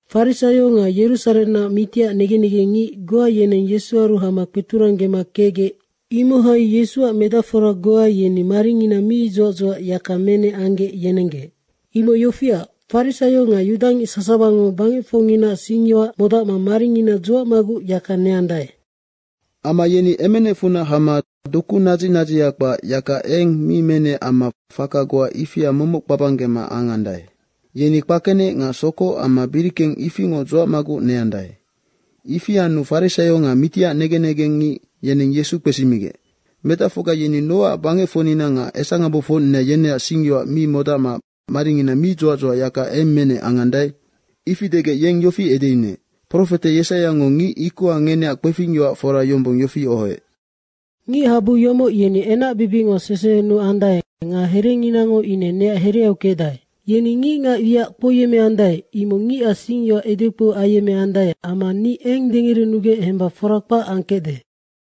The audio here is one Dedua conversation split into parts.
Farisaio nga Yerusarennac mitiac negen negengngic goa yeneng Yesuaru hama kpeturanggema kecgec, imohai Yesuac medacfora goa yeni maringina mi dzuac dzuac yaka menec anggec yenenggec. Imoc yofiac, farisaio nga yudangic sasawango bangecfocnginaac singyoac modacma maringina dzuacmaguc yaka neandae. Amma yeni emenecfunac hama doku nadzic nadziha kpac yaka eng mi menec amma faka goa ifia momoc kpabanggema angandae. Yeni kpakenec nga sokoc amma birikeng ifingoc dzuacmaguc neandae. Ifi anu farisaio nga mitiac negen negengngic yeneng Yesu kpesimigec, “Medacfocga yeni nocac bangecfocnina nga esangabofocnina yeneac singyoac mi modacma maringina mi dzuac dzuac yaka eng menec angandae?” ifi degec yeng yofi edeyunuec, “Profete Yesaiango ngic ikoha ngeneacnoc kpefing fora yombong yofi ohoec, ‘Ngichabu yomoc yeni enacbibicngo sesehenuandae nga herenginango ine neac hereau kecdae. Yeni ngicngac wiac kpouyemmeandae, imoc ngicac singyoac edekpou ayemmeandae amma ni eng dengerenugec hemba fora kpac angkecde.’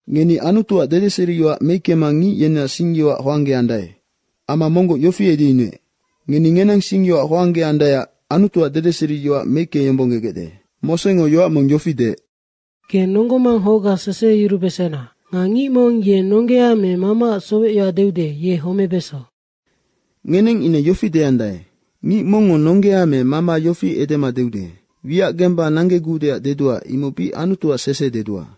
Ngeni Anutuac dedeseriyoac meickema ngic yeneac singyoac hoanggeandae.” Amma monggoc yofi edeyunuec, “Ngeni ngenang singyoac hoanggeandaeac Anutuac dedeseriyoac meickeyombonggegecde. Mosengo yoac mong yofi deec, ‘Ge nonggo manghocga seseheyurubesena.’ nga ‘Ngic mong ye nonggea me mamaac sowecyoac deude, ye homebeso.’” Ngeneng ine yofi deandae, “Ngic mongngo nonggea me mama yofi edema deude, ‘Wiac gemba nanggegudeac dedua, imoc bic Anutuac sese dedua.’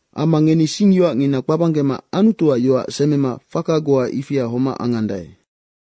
Amma ngeni singyoacngina kpabanggema Anutuac yoac semema faka goa ifia homac angandae.”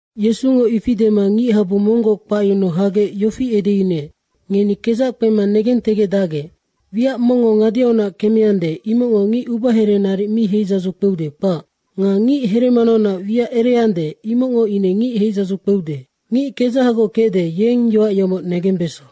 Yesungo ifi dema ngichabu monggoc kpacyunuu hagec yofi edeyunuec, “Ngeni kedzac kpema negentegecdacgec. Wiac mongngo ngadeaunac kemeande, imocngo ngic ubahere naric mi heidzadzu kpeude, kpac. Nga ngic heremanaunac wiac ereande, imocngo ine ngic heidzadzu kpeude. Ngic kedzahagoc kecde, yeng yoac yomoc negembeso.”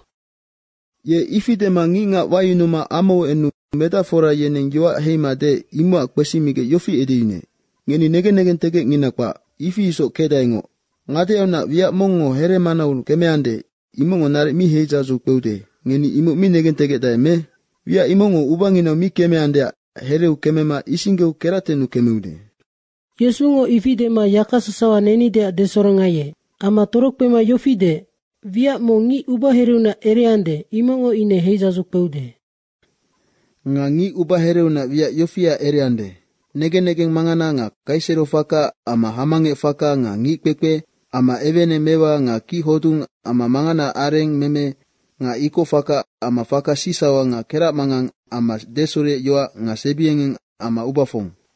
Ye ifi dema ngicngac wayunuma amau enu medacfora yeneng yoac heima deec, imocac kpesimigec yofi edeyunuec, “Ngeni negen negentegecngina kpac, ifi isoc kecdaengoc. Ngadeaunac wiac mong heremanau kemeande, imocngo naric mi heidzadzu kpeude, ngeni imoc mi negentegecdae me? Wiac imocngo ubanginau mi kemeandeac hereu kemema isinggeu keractennu kemeude.” Yesungo ifi dema yaka sasawa nenideac desorongaiec. Amma torokpema yofi deec, “Wiac mong ngic ubahereunac ereande, imocngo ine heidzadzu kpeude. Nga ngic ubahereunac wiac yofia ereande, negen negeng mangana nga Kaiserofaka amma hamangecfaka nga ngickpekpe amma eweeneng mewa nga kic hodung amma manganaac areng meme nga ikoc faka amma faka sicsauha nga keracmangang amma desureyoac nga sebiengeng amma ubafong,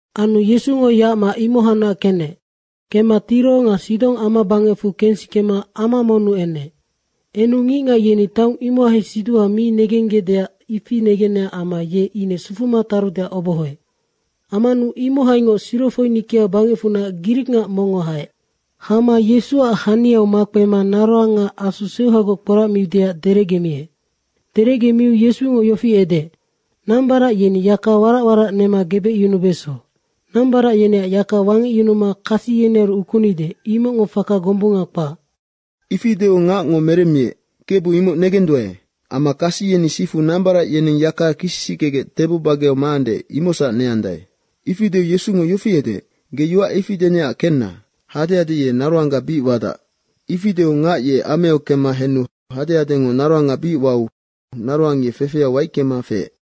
Anu Yesungo yacma imohacnac kenec. Kemma Tiro nga Sidong amabangecfu kensikema ama monnu enec. Enu ngicngac yeni taong imohai siduha mi negenggecdeac, ifi negenec amma ye ine sufuma tarudeac obohoec. Ammanu imohaingoc Sirofoinikia bangecfunac grikngac mongngo haec. Hama Yesuac haniu makpema naroanga asu seuhagoc kporacmiudeac derecgemiec. Derecgemiu Yesungo yofi edeec, “Nambarac yeni yaka warac warac nema gebecyunubeso. Nambarac yeneac yaka wangecyunuma kasi yenearu ukunide, imocngo faka gombunga kpac.” Ifi deu ngacngo meremmiec, “Kebu, imoc negenduae, amma kasi yeni sifu nambarac yeneng yaka kisisickegec tebo bageau maande, imocsac neandae.” ifi deu Yesungo yofi edeec, “Ge yoac ifi denecac kenna, hadehade ye naroangga bic wadac.” Ifi deu ngac ye ameau kemma henu hadehadengo naroanga bic wau naroang ye fefeau waickema feec.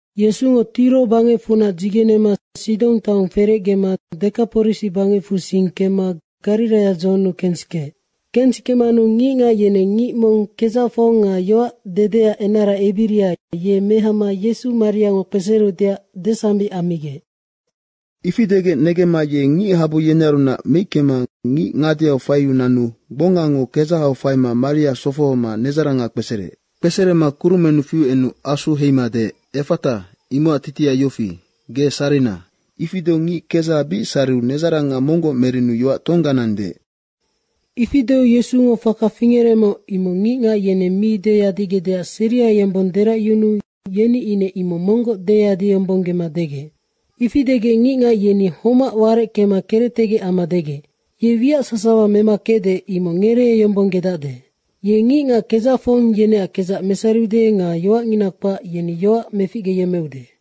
Yesungo Tiro bangecfunac dzigenema Sidong taong ferecgema Dekaporisi bangecfu sing kemma Gariraia dzohonnu kensikeec. Kensikemanu ngicngac yeneng ngic mong kedzacfong nga yoac dedeac enara ebiria, ye mehama Yesu mariango kpesereudeac desambic ammigec. Ifi degec negemma ye ngichabu yenearunac meickema ngic ngadeau faiu nanu gbongango kedzahau faima mariau sofohoma nedzaranga kpesereec. Kpeserema kurumennu fiu enu asu heima deec, “Effata!” Imocac titiha yofi, “Ge sarina!” Ifi deu ngic kedzaha bic sariu nedzaranga monggoc merenu yoac tongganang deec. Ifi deu Yesungo faka fingerecmoc, imoc ngicngac yeneng mi deyadigecdeac seria yombong deracyunuu yeni ine imoc monggoc deyadiyombonggema degec. Ifi degec ngicngac yeni homac wareckema kerectegec amma degec, “Ye wiac sasawa mema kecde, imoc ngereeyombonggedacde. Ye ngicngac kedzacfong yeneac kedzac mesariude nga yoacngina kpac, yeni yoac meficgeyemmeude.”